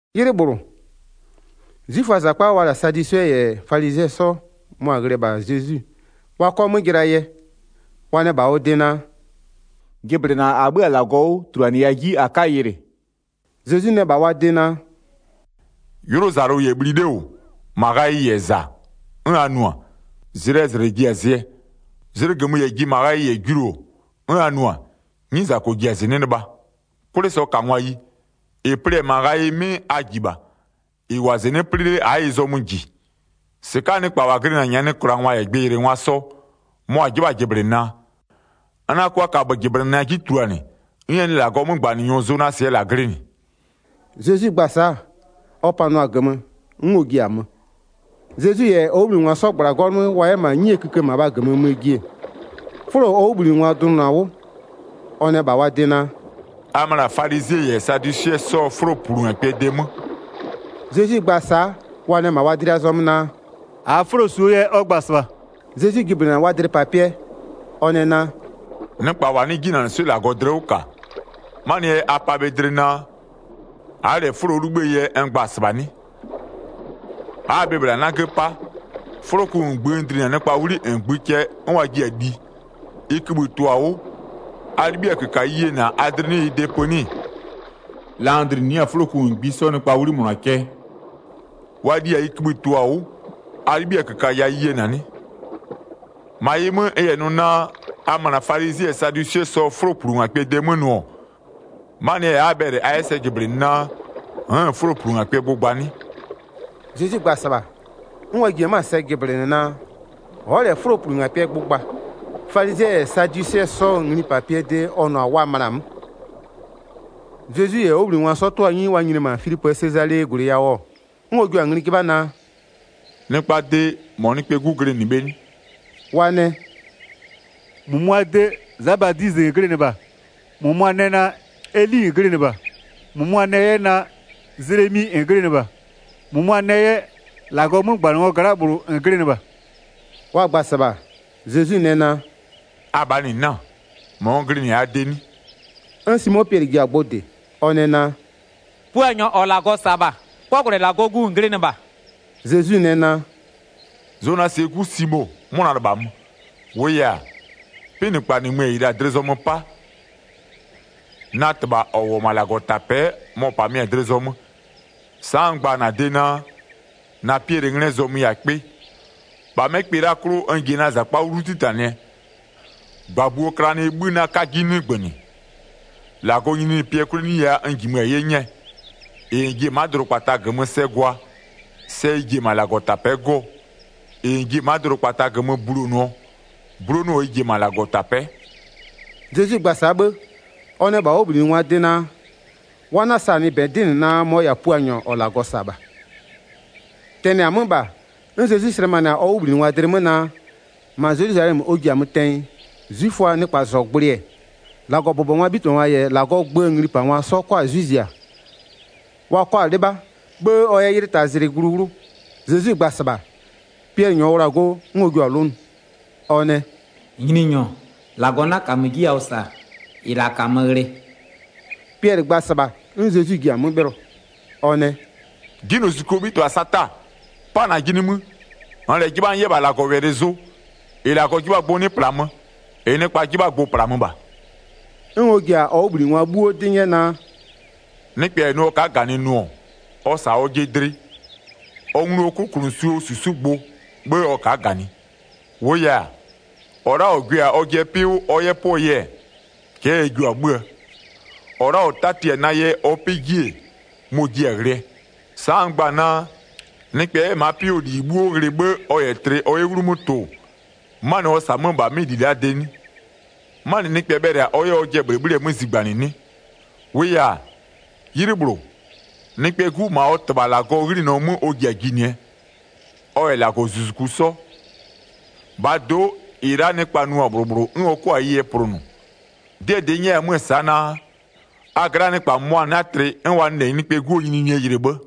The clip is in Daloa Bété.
'Ylɩ -bhlʋ, 'zwiföaa -zakpa wa la-a sadwisɩɛ -yɛ falizɩɛ 'sɔ mʋa-a ghlɩ-ɛ -bha Zezwi wa 'kɔ 'mö jɩlaa yɛ. Wa nɛ -bha ɔ de naa: “Jɩblɩna -a 'bhö-a -Lagɔ 'wʋ, -tuluanɩya 'ji -a 'ka yɩlɩ.” Zezwi nɛ -bha wa de naa: “'Ylʋzalʋ -yɛ bhli 'le -wʋ, -ma ghayɩ -yɛ -za, 'n a nʋ-a, zlɩɛ -zlɩ ji-a zɩɛ. Zlɩgömö -yɛ ji -ma ghayɩ -yɛ julu-o, 'n a nʋ-a, 'nyizako ji-a -zɩnɩ'ɩ lɩbha. 'Kwlɩsɔkangwayi, -ɩ plɩ-ɛ -ma ghayɩ 'mɩ a -ji -bha, -ɩ -wʋ-a -zɩnɩ'ɩ 'plɩ 'le a'a ɩ zɔmö -ji. 4-Sɩka'aa nɩkpa -wa glɩnɩ-a nyanɩklangwa -yɛ gbɩyɩlɩngwa sɔ, mʋa-a 'jɩbha-a jɩblɩnaa? N 'na 'kʋa kaböjɩblɩna 'ji tuluanɩ, 'n ɛ nɩ -Lagɔɔ 'mögbanɩnyɔ Zonasɩɛ -la glɩnɩ.” Zezwi gba-a sa'a, ɔ panʋa-a -gömö, 'n ɔ ji-a mö. Zezwi -yɛ ɔ 'wʋbhlinɩngwa 'sɔ -gbla-a 'gɔlʋ 'mö wa 'yɛ -ma 'nyie kïkë -mabha -gömö möö ji-e, 'fʋlo ɔ 'wʋbhlinɩngwa dlʋnʋ-a 'wʋ. Ɔ nɛ -bha wa de naa: “A möna falizɩɛ -yɛ sadwisɩɛ 'sɔɔ 'fʋloplungakpɩɛ de 'mö.” Zezwi gba-a sa'a, wa nɛ -ma wa dlɩa zɔmö naa: “-Aa 'fʋlo -suo yɛ ɔ gba-a -sɩbha.” Zezwi jɩblɩnɩ-a wa dlɩpapɩɛ, ɔ nɛ naa: “Nɩkpa -wa 'nɩ 'jinanɩswɩ'ɩ -Lagɔ dlɩ 'wʋ -ka, 'manɩɛ yɛ a pa bhe dlɩ naa: A'a -lɛ 'fʋlo 'wʋ 'libhïë yɛ n gba-a -sɩbha 'nɩ? A'a-a bhe -bhla 'nagö 'pa? 'Fʋloku -ngbï n dlinɩ-a nɩkpaa 'wli -ngbï cɛ 'n wa jiɩ-a li, ɩ kïbhï -ɩ tʋ-a 'wʋ, a 'libhiɩ-a -köka ɩ yena a dlɩ 'nɩ ɩ de pö 'nɩ-ɩ? La n dlinɩ 'yɛ-a 'fʋloku -ngbisɔ nɩkpaa 'wli -mʋna cɛ, wa li-a ɩ kïbhï -ɩ tʋ-a 'wʋ, a 'libhiɩ-a -köka ya ɩ yena 'nɩ? 11-Ma ɩ 'mö, n -yɛ nʋ naa a möna falizɩɛ -yɛ sadwisɩɛ 'sɔɔ 'fʋloplungakpɩɛ de 'mö nʋ-ɔ, 'manɩɛ yɛ a'a-a bhɛlɩ a 'yɛ sɛ jɩblɩnɩ naa, n'n-n 'fʋloplungakpɩɛ gbʋ gba 'nɩ?” Zezwi gba-a -sɩbha, 'n wa jie 'mö-a sɛ jɩblɩnɩ naa: Ɔ'ɔ -lɛ 'dɛdɛ'ɛ 'fʋloplungakpɩɛ gbʋ gba, falizɩɛ -yɛ sadwisɩɛ 'sɔɔ nglipapɩɛ de ɔ nʋ-a wa möna 'mö. Zezwi -yɛ ɔ 'wʋbhlinɩngwa 'sɔ 'tʋ-a 'nyi wa nyini-e -ma Filipöö Sezalee -gwlɩ yawʋ-ɔ, 'n ɔ jua-a ngli 'jɩbha naa: “Nɩkpaa de, -mɔ Nɩkpɛɛ 'Gu glɩnɩ bhe 'nɩ?” Wa nɛ: “-Mʋmʋaa de, Za Badizɩ -n glɩnɩ -bha, -mʋmʋa nɛ naa: Eli -n glɩnɩ -bha, -mʋmʋa nɛ 'yɛ naa: Zelemi -n glɩnɩ -bha, -mʋmʋa nɛ 'yɛ -Lagɔɔ 'mögbanɩngwaa gla'aa -bhlʋ -n glɩnɩ -bha.” Wa gba-a -sɩbha, Zezwi nɛ naa: “Abhaa -nɩ 'na-a, -mɔ n glɩnɩ-a a de 'nɩ?” 'N Simo Piɛlɩ ji-a gbʋ -dɩ, ɔ nɛ naa: “Puanyɔ -ɔ -Lagɔ -sa-a -bha, 'kɔgwlɛ -Lagɔɔ Gu -n glɩnɩ -bha.” Zezwi nɛ naa: “Zonasɩɛ 'gu Simo, 'mʋna -lɩbhamö. -Wʋʋ yɛ-a, 'pɩnɩkpa -nɩmö-ö -ɩ -la dlɩ zɔmö 'pa, na -Tɩbha -ɔ -wʋ-ɔ -ma -Lagɔtapɛ'ɛ, mɔ-ɔ -pamɩ-a dlɩ zɔmö. Sa'a n gba-a -na de naa, -na Pɩɛlɩnglɩɛ zɔmö yɛ-a kpɩ. -Bha 'mɛ kpɩ la'aa 'klʋ n ji-e na -zakpa 'wlu 'titanɩɛ, -gbabuoo klanɩɛ 'bhï 'na 'ka 'ji 'nɩgbönɩ. 19-Lagɔɔ nyininyinipɩɛ 'kwleneyia n -jimö-a 'ye 'nyɛɛ. -Ɩ -n ji-e ma'a dʋdʋkpata -gömö sɛ gwa, sɛ ɩ ji-e -ma -Lagɔtapɛ'ɛ 'gɔɔ. -Ɩ -n ji 'yɛ-ɛ ma'a dʋdʋkpata -gömö bulonʋɔ, 'bulonʋɔ ɩ 'jio-o -ma -Lagɔtapɛ'ɛ.” Zezwi gba-a sa'a 'bhë, ɔ nɛ -bha ɔ 'wʋbhlinɩngwaa de naa: Wa 'na-a -sanɩ -bɛ 'dɩ -nɩ naa mɔ-ɔ -yɛ-a Puanyɔ -ɔ -Lagɔ -sa-a -bha. Tɛnɩ-a 'mö -bha, 'n Zezwi slɛmanɩ-a ɔ 'wʋbhlinɩngwa dlɩ 'mö naa, -ma Zelwizalɛmö ɔ ji-a möö tɛnyɩ 'zwiföa nɩkpazɔgblʋɩ-ɛ, -Lagɔbʋbɔngwaa 'bhitɩbhangwa -yɛ -Lagɔɔ gböö nglipangwa 'sɔ 'kɔ 'zwɩ zia, wa 'kɔ 'lɩbha, 'bhë ɔ 'yɛ 'ylɩ taa zlɩ glu 'wlʋ. Zezwi gba-a -sɩbha, Piɛlɩ -nyɔɔ wla-a go 'n ɔ jio-a 'lʋnʋ. Ɔ nɛ: “Nyininyɔ, -Lagɔ 'na -kamö 'ji yawʋ -sa -ɩ -la -kamö ghlɩ.” Piɛlɩ gba-a -sɩbha 'n Zezwi ji-a 'mö 'bhɩlɔ, ɔ nɛ: “'Jinylozuzukuo 'bhitɩbha Sata, 'pa -najɩ nimï, -nn -lɛ 'jɩbha n 'yɛ -bha -Lagɔwɛlɩ zʋ, -ɩ -Lagɔ 'jɩbha-aa gbʋ 'nɩ -plamö, -ɩ nɩkpa 'jɩbha-aa gbʋ-ʋ -plamö -bha.” 'N ɔ ji-a ɔ 'wʋbhlinɩngwa 'bhuo 'dɩ 'nyɛ naa: “Nɩkpɛ -yɛ nʋ ɔ ka'a -ganɩ nʋ-ɔ, ɔ -sa ɔjɩ dlɩ, ɔ nglu ɔ 'klʋkʋnʋsuo -susugbʋ, 'bhë ɔ ka'a -ganɩ. 25-Wʋʋ yɛ-a, -ɔ la'a -ɔ gwɩ-a ɔ 'pɩ 'wʋ ɔ 'yɛ 'pʋɔ yɛ, cɛ'ɛ ɛ jio-a 'bhö-öö. -Ɔ la'a -ɔ tati-a na yɛ ɔ 'pɩ 'ji-e, mɔ-ɔ jiɛ-a ghlɩɛ. Sa'a n gba-a naa: Nɩkpɛ 'yɛ ma'a 'pɩ 'wʋɔ -li 'bhuo ghlɩ 'bhë ɔ -yɛ tlɩ ɔ 'yɛ 'wlumö tʋ-ʋ, 'manɩ ɔ -sa-a 'mö-ö -bha 'mɩ -li la'aa de 'nɩ? 'Manɩ nɩkpɛ bhɛlɩ-a ɔ 'yɛ 'yɛ ɔjɩɛ -bhlɩbhlɩɛ 'mö zigbanɩ 'nɩ? 27-Wʋʋ -yɛ-a, 'ylɩ -bhlʋ, Nɩkpɛɛ 'Gu -ma ɔ -Tɩbha -Lagɔɔ 'ghlinɔ 'mö ɔ ji-a jinɩɛ, ɔ -yɛ -Lagɔzuzuku 'sɔ. -Bhaa do'o, -ɩ la'a nɩkpa nʋ-a -bhlʋ -bhlʋ 'n ɔ 'kʋa-a ɩ yɛ plʋnʋ. 'Dɩɛ -dɩ n nyɛya 'mö-ö sa'a naa: A gla'aa nɩkpa -mʋmʋa 'na tlɩ 'n wa nɩ -lɛ Nɩkpɛɛ 'Guo nyininyinie yɩlɩ 'bhë.”